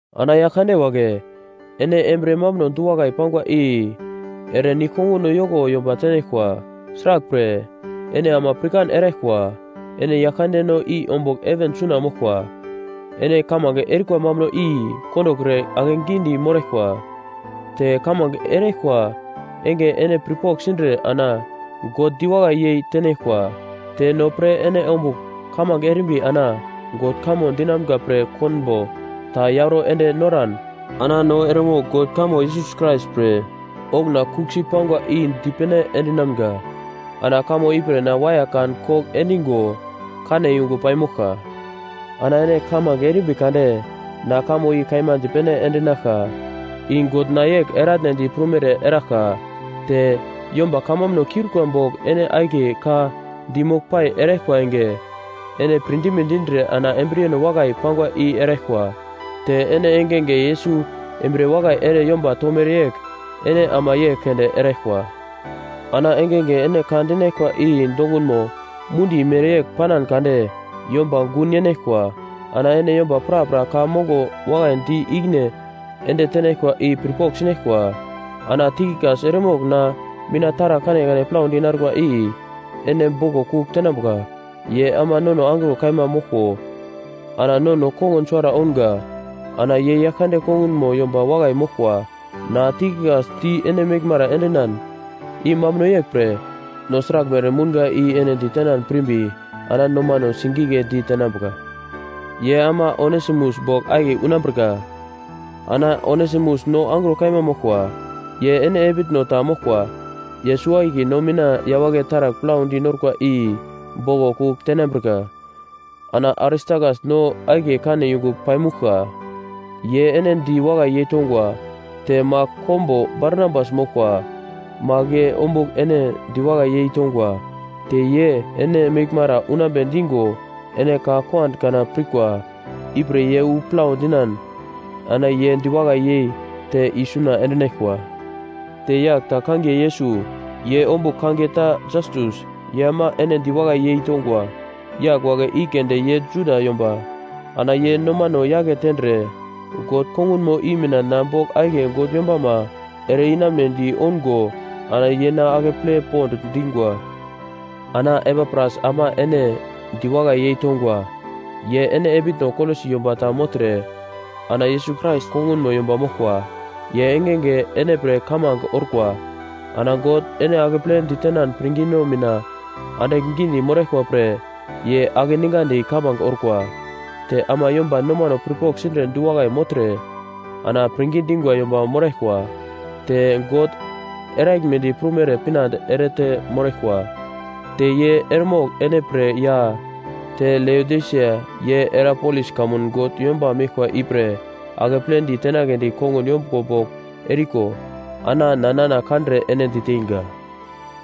Ana yagl kande wagle, ene embriye mambuno du-wakai pangwa i ere nigl-konguno yoko yomba tenaglkwa. Sraglpre, ene ama pirkan eraglkwa, ene Yaglkandeno i ombugl heven suna moglkwa. Ene kamange erikwa mambuno i kondokre ake gidi moraglkwa, te kamange eraglkwa enge ene pirpogl sindre ana God diwakai yei tenaglkwa. Te no pre ene ombugl kamange erimbi ana God kamo dinamga pre konbo ta yauro ende noran ana no eremogl God kamo Yesus Krais pre okuna kuglsi pangwa i di pene endinamga, ana kamo ipre na waiya kan kogl endingo kane yungu pai moglka. Ana ene kamange erimbi kade na kamo i kaima dipene endinaglka, i God na yegl eratnedi prumere eraglka. Te yomba kamambuno kiurikwa bogl ene akiye ka di moglpai eraglkwa enge, ene pirdime dindre ana embriyeno wakai pangwa i eraglkwa. Te ene engenge Yesus embriye wakai ere yomba tomere yegl ene ama yegl keunde eraglkwa. Ana engenge ene ka dinaglkwa i dongunmo mundi mereyegl panan kade yomba gun yenaglkwa. Ana ene yomba prapra ka mongo wakai di ikine ende tenaglkwa i pirpogl sinaglkwa. Ana Tikikas eremogl na mina taragl kanekane plaudi narkwa i ene boglo kugl tenambuka. Ye ama nono angro kaima moglko ana nono kongun suwara ounga, ana ye Yaglkande kongunmo yomba wakai moglkwa. Na, Tikikas di ene meglmara endinan, i mambuno yegl pre, no sraglmere mounga i ene ditenan pirmbi ana nomano sigigledi tenambuka. Ye ama Onesimus bogl akiye unambrika. Ana Onesimus no angro kaima moglkwa, ye ene epitno ta moglkwa. Ye suwo-akiye no mina yawagle taragl plaudi norkwa i boglo kugl tenambrika. Ana Aristakas no akiye kane yungu paimuglka, ye ene di wakai yeitongwa. Te Mak kombo Barnabas moglkwa, Mak ye ombugl ene diwakai yei tongwa. Te ye, ene meglmara unambe dingo ene ka kuand kana pirkwa, ipre ye wu plau dinan ana ye diwakai yei te isuna endinaglkwa. Te yagl ta kangiye Yesus, ye ombugl kangiye ta Jastus, ye ama ene diwakai yei tongwa. Yagl wagle i keunde ye Juda yomba, ana ye nomano yake tendre God kongunmo i mina na bogl akiye God yombama ere-inambedi oungo ana ye na akeple pond dingwa. Ana Epapras ama ene diwakai yei tongwa, ye ene epitno Kolosi yomba ta mogltre ana Yesus Krais kongunmo yomba moglkwa. Ye engenge ene pre kamange orkwa, ana God ene akeple ditenan pirngino mina andigl gidi moraglkwa pre ye akeningandi kamange orkwa. Te ama yomba nomano pirpogl sindre du-wakai mogltre ana pirngi dingwa yomba moraglkwa, te God eraglmedi prumere pinande erete moraglkwa. Te ye eremogl ene pre ya, te Leodisia ye Hierapolis kamun God yomba meglkwa ipre akepledi tenagledi kongun yombuglo bogl eriko ana na nana kandre ene diteinga.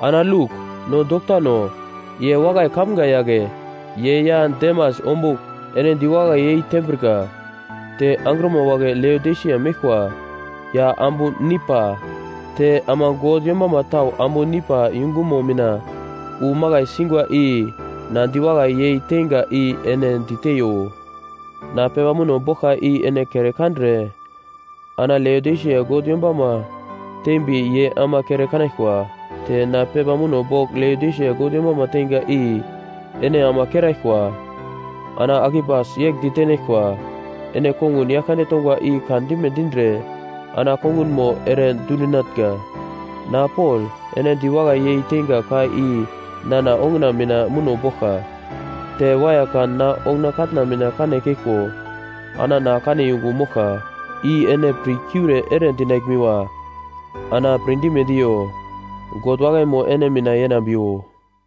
Ana Luk, no doktano, ye wakai kamga yagle, ye ya Demas ombugl ene diwakai yei tembrika. Te angrima wagle Leodisia meglkwa ya ambu Nimpa, te ama God yombama tau ambu Nimpa yungumo mina wu makai singwa i na di wakai yei tenga i ene diteiyo. Na pepa muno boglka i ene kere kandre ana Leodisia God yombama teimbi ye ama kere kanaglkwa. Te na pepa muno bogl Leodisia God yombama teinga i ene ama keraglkwa. Ana Akipas yegl ditenaglkwa, “Ene kongun Yaglkande tongwa i kan dime dindre ana kongunmo ere dundinatnga.” Na Pol, ene diwakai yei teinga ka i nana onguna mina muno boglka. Te waiya kan na onguna katna mina kane keglko ana na kane yungu moglka, i ene pirkiure ere dinaglmiwa ana pirdime diyo. God wakaimo ene mina yenambiwo.